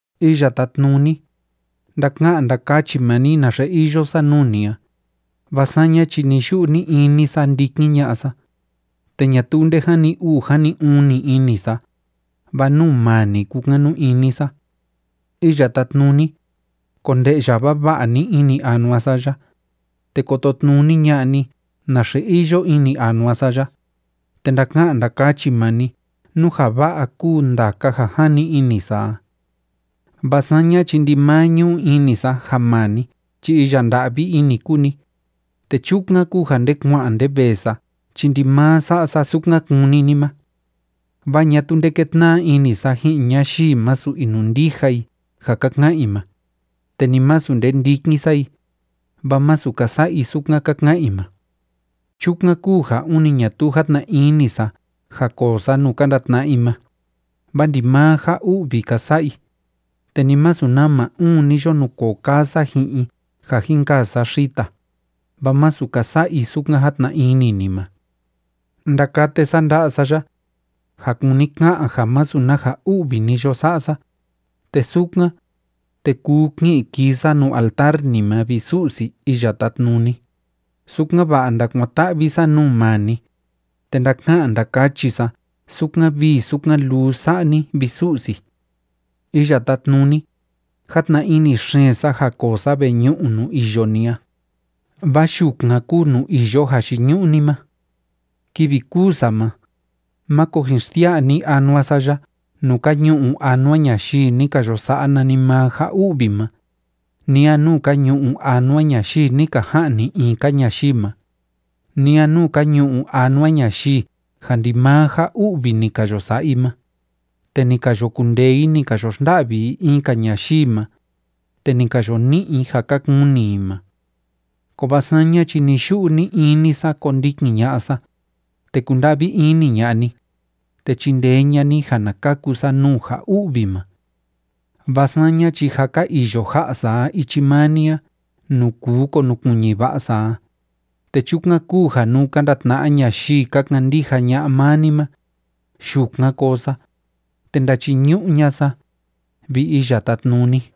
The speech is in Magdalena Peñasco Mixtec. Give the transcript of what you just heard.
Iya Tátnuni, ndaka'an ndakachi maa ni naxe iyo sa nuu ni a, vaa saña chi ni‑yu'u ni‑ini sa ndikin ña'a sa, te ñatuu nde jani uu jani uni ini sa, vaa nuu maa ni kúkanu ini sa. Iya Tátnuni, konde'ya vava'a ni ini anua sa ya, te kototnuni ña'a ni naxe iyo ini anua sa ya, te ndaka'an ndakachi maa ni nú ja va'a kúu ndaka ja jani ini sa a. Vaa saña chi ndimaa ñu'u ini sa ja maa ni chi iya nda'vi ini kúu ni, te chukan kúu ja nde kua'an nde vee sa chi ndimaa sa'a sa sukan kúni ni ma. Vaa ñatuu nde kétna'a ini sa ji'in ñayii masu inundija i ja ka ka'an i ma, te ni masu nde ndikin sa i, vaa masu ka sa'a i sukan ka ka'an i ma. Chukan kúu ja ûni ñatuu játna ini sa ja koo sa nuu ka ndatna'a i ma, vaa ndimaa ja u'vi ka sa'a i, te ni masu nama uun ni yo nukoo kaa sa ji'in i ja jin kaa sa xita, vaa masu ka sa'a i sukan játna ini ni ma. Ndakate sa nda'a sa ya, ja kúni ka'an ja masu na ja u'vi ni yo sa'a sa, te sukan, te kuu ki'in kii sa nuu altar ni ma, vi Su'si Iya Tátnuni, sukan‑va'a ndakuan‑ta'vi sa nuu maa ni, te ndaka'an ndakachi sa sukan vii sukan luu sa'a ni, vi Su'si. Iya Tátnuni, játna ini xeen sa ja koo sa veñu'u nuu iyo ni a, vaa yukan kúu nuu iyo jayiñu'u ni ma. Kivi kûu sa ma, máko jin xsia'a ni anua sa ya nuu ka ñu'u anua ñayii ni ka yo sa'a nanimaa ja u'vi ma, ni a nuu ka ñu'u anua ñayii ni ka ja'ni i in‑ka ñayii ma, ni a nuu ka ñu'u anua ñayii ja ndimaa ja u'vi ni ka yo sa'a i ma, te ni ka yo kundee i ni ka yo xnda'vi i in‑ka ñayii ma, te ni ka yo ni'i i ja ka kuni i ma. Kovaa saña chi ni‑yu'u ni‑ini sa kondikin ña'a sa, te kunda'vi ini ña'a ni, te chindee ña'a ni ja na kaku sa nuu ja u'vi ma. Vaa saña chi jâ ka iyo ja'a sa a ichi maa ni a nuu kuu konukuiñi va'a sa a, te chukan kúu ja nuu ka ndatna'a ñayii ka kandija ña'a maa ni ma, yukan koo sa, te ndachiñu'u ña'a sa, vi Iya Tátnuni.